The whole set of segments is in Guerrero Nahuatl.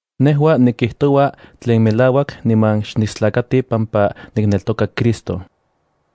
Nejua nikijtoua tlen melauak niman xnistlakati pampa nikneltoka Cristo.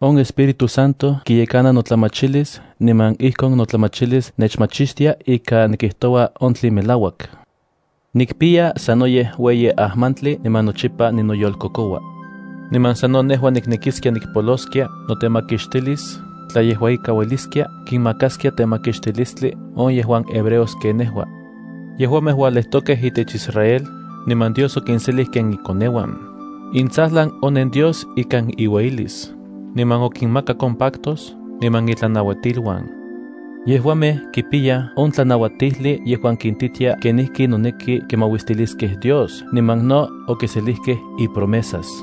On Espíritu Santo kiyekananotlamachilis niman ijkon notlamachilis nechmachistia ika nikijtoua on tlen melauak. Nikpiya sanoyej ueyi ajmantli niman nochipa ninoyolkokoua. Niman sano nejua niknekiskia nikpoloskia notemakixtilis tla yejua ika ueliskia kinmakaskia temakixtilistli on yejuan hebreos ken nejua. Yejuamej ualejtokej itech Israel, niman Dios okinselij ken ikoneuan. Intsajlan onen Dios ikan iueyilis, niman okinmakak on pactos niman itlanauatiluan. Yejuamej kipiyaj on tlanauatijli yejuan kintitia kenijki noneki kimauistiliskej Dios niman no okiselijkej ipromesas.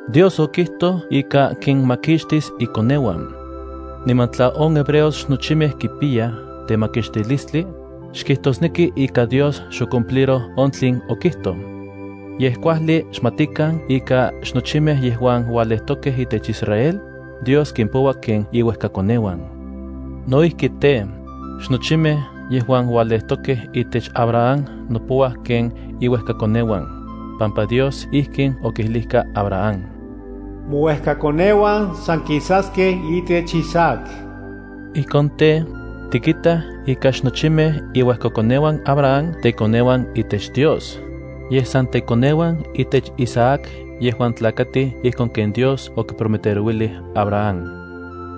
Dios okijtoj ika kinmakixtis ikoneuan. Niman tla on hebreos xnochimej kipiyaj temakixtilistli, xkijtosneki ika Dios xocumpliroj on tlen okijtoj. Yej kuajli xmatikan ika xnochimej yejuan ualejtokej itech Israel, Dios kimpoua ken iuejkakoneuan. No ijki tej, xnochimej yejuan ualejtokej itech Abraham nopouaj ken iuejkakoneuan, pampa Dios ijkin okijlijka Abraham: “Mouejkakoneuan san kisaskej itech Isaac.” Ijkon tej, tikitaj ika xnochimej iuejkakoneuan Abraham tekoneuan itech Dios, yej san tekoneuan itech Isaac yejuan tlakatij ijkon ken Dios okiprometerouilij Abraham.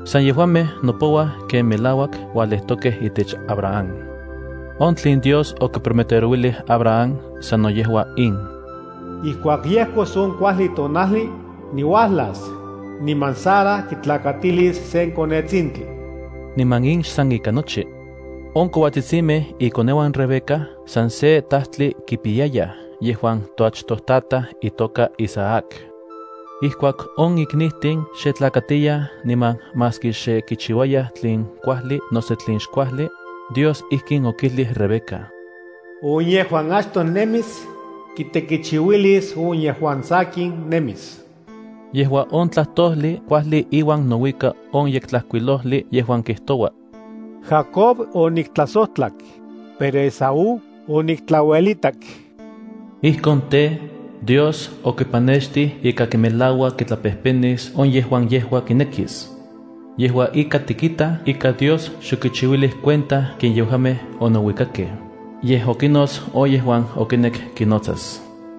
San yejuamej nopouaj ken melauak ualejtokej itech Abraham. On tlen Dios okiprometerouilij Abraham sano yejua in: “Ijkuak yejkos on kuajli tonajli, niuajlas, niman Sara kitlakatilis sen konetsintli.” Niman in xsan ika nochi. On kouatsitsimej ikoneuan Rebeca san se tajtli kipiyayaj yejuan toachtojtataj itoka Isaac. Ijkuak on iknijtin xe tlakatiyaj niman maski xe kichiuayaj tlen kuajli noso tlen xkuajli, Dios ijkin okijlij Rebeca: “On yejuan achtoj nemis, kitekichiuilis on yejuan sakin nemis.” Yejua on tlajtojli kuajli iuan nouika on Yektlajkuilojli yejuan kijtoua: “Jacob oniktlajsojtlak, pero Esaú oniktlauelitak.” Ijkon tej, Dios okipanextij ika kimelaua kitlapejpenis on yejuan yejua kinekis. Yejua ika tikitaj ika Dios xokichiuilij cuenta ken yejuamej onouikakej, yej okinots on yejuan okinek kinotsas.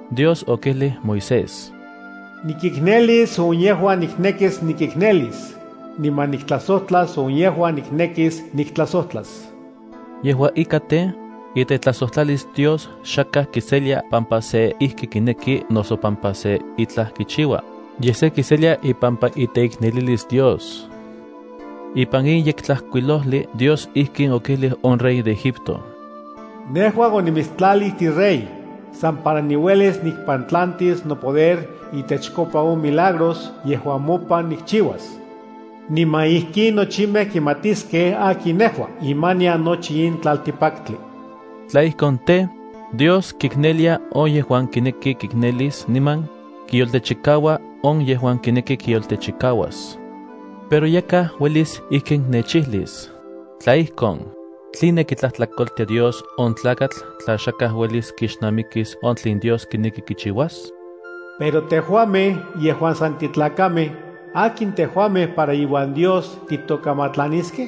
Dios okijlij Moisés: “Nikiknelis on yejuan niknekis nikiknelis, niman niktlajsojtlas on yejuan niknekis niktlajsojtlas.” Yejua ika tej, itetlajsojtlalis Dios xakaj kiselia pampa se ijki kineki noso pampa se itlaj kichiua, yej se kiselia ipampa iteiknelilis Dios. Ipan in Yektlajkuilojli Dios ijkin okijlij on rey de Egipto: “Nejua onimitstlalij tirey, san para niuelis nikpantlantis nopoder itechkopa on milagros yejuan mopan nikchiuas. Niman ijkin nochimej kimatiskej akin nejua imanian nochi in tlaltikpaktli.” Tla ijkon tej, Dios kiknelia on yejuan kineki kiknelis, niman kiyoltechikaua on yejuan kineki kiyoltechikauas. Pero yakaj uelis ijkin nechijlis: “Tla ijkon, ¿tline kitlajtlakoltia Dios on tlakatl tla xakaj uelis kixnamikis on tlen Dios kineki kichiuas? Pero tejuamej yejuan san titlakamej, ¿akin tejuamej para iuan Dios titokamatlaniskej?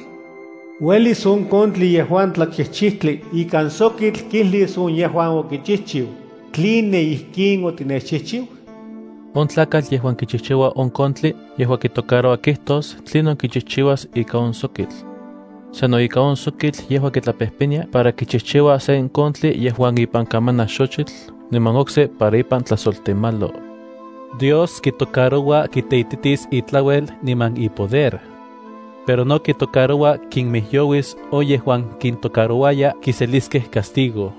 ¿Uelis on kontli yejuan tlachijchijtli ikan sokitl kijlis on yejuan okichijchiu, “¿Tline ijkin otinechchijchiu?” On tlakatl yejuan kichijchiua on kontli yejua kitocaroua kijtos tlinon kichijchiuas ika on sokitl. Sano ika on sokitl yejua kitlapejnenia para kichijchiua sen kontli yejuan ipan kamanaj xochitl niman okse para ipan tlajsoltemalo. Dios kitocaroua kiteititis itlaluel niman ipoder. Pero no kitocaroua kinmijyouis on yejuan kintocarouaya kiseliskej castigo.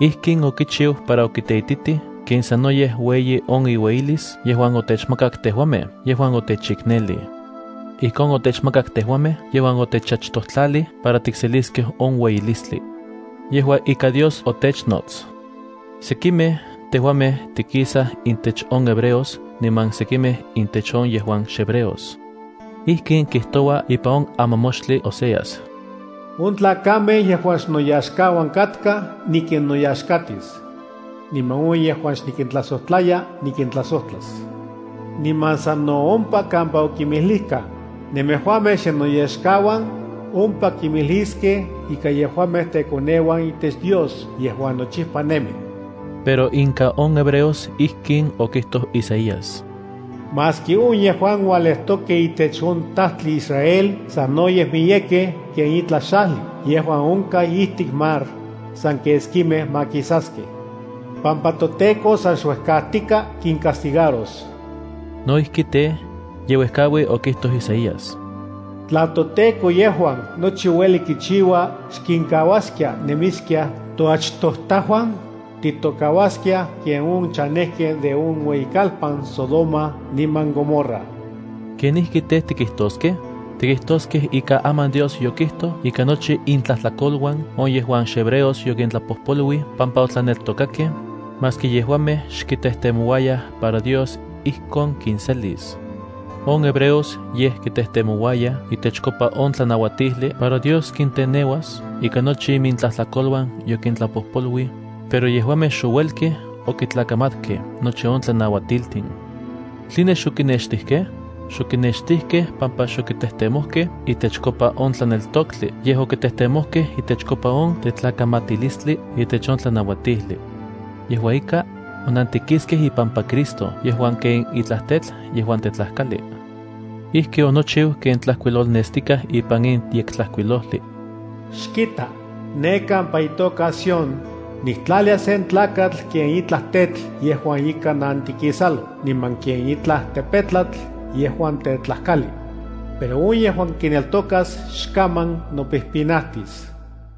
Ijkin okichiu para okiteititij ken sanoyej ueyi on iueyilis yejuan otechmakak tejuamej yejuan otechiknelij. Ijkon otechmakak tejuamej yejuan otechachtojtlalij para tikseliskej on ueyilistli. Yejua ika Dios otechnots. Sekimej tejuamej tikisaj intech on hebreos niman sekimej intech on yejuan xhebreos. Ijkin kijtoua ipan on amamoxtli Oseas: On tlakamej yejuan xnoyaxkauan katkaj nikinnoyaxkatis. Niman on yejuan xnikintlajsojtlaya nikintlajsojtlas. Niman sano ompa kampa okinmijlijkaj: “Nemejuamej xnennoyaxkauan”, ompa kimijliskej ika yejuamej tekoneuan itech Dios yejuan nochipa nemi. Pero inka on hebreos ijkin okijtoj Isaías: “Maski on yejuan ualejtokej itech on tajtli Israel, sanoyej miyekej ken itlaj xajli yejuan onkaj ijtik mar, san keskimej makisaskej, pampa toTEKO san xuejkajtika kincastigaros.” No ijki tej, ye uejkaui okijtoj Isaías: Tla toTEKO yejuan nochi ueli kichiua xkinkauaskia nemiskiaj toachtojtajuan, titokauaskiaj ken on chanejkej de on ueyikalpan Sodoma niman Gomorra. ¿Kenijki tej, tikijtoskej? Tikijtoskej ika aman Dios yokijtoj ika nochi intlajtlakoluan on yejuan xhebreos yokintlapojpoluij pampa otlaneltokakej, maski yejuamej xkitejtemouayaj para Dios ijkon kinselis. On hebreos yej kitejtemouayaj itechkopa on tlanauatijli para Dios kiteneuas ika nochi imintlajtlakoluan yokintlapojpoluij, pero yejuamej xouelkej okitlakamatkej nochi on tlanauatiltin. ¿Tline xokinextijkej? Xokinextijkej pampa xokitejtemojkej itechkopa on tlaneltoktli, yej okitejtemojkej itechkopa on tetlakamatilistli itech on tlanauatijli. Yejua ika, onantikiskej ipampa Cristo yejuan ken itlaj tetl yejuan tetlajtlakali. Ijki onochiu ken tlajkuilolnestikaj ipan in Yektlajkuilojli: Xkita, ne kampa itoka Sión, niktlalia sen tlakatl ken itlaj tetl yejuan ika nantikisalo, niman ken itlaj tepetlatl yejuan tetlajkali. Pero on yejuan kineltokas xkaman nopijpinatis.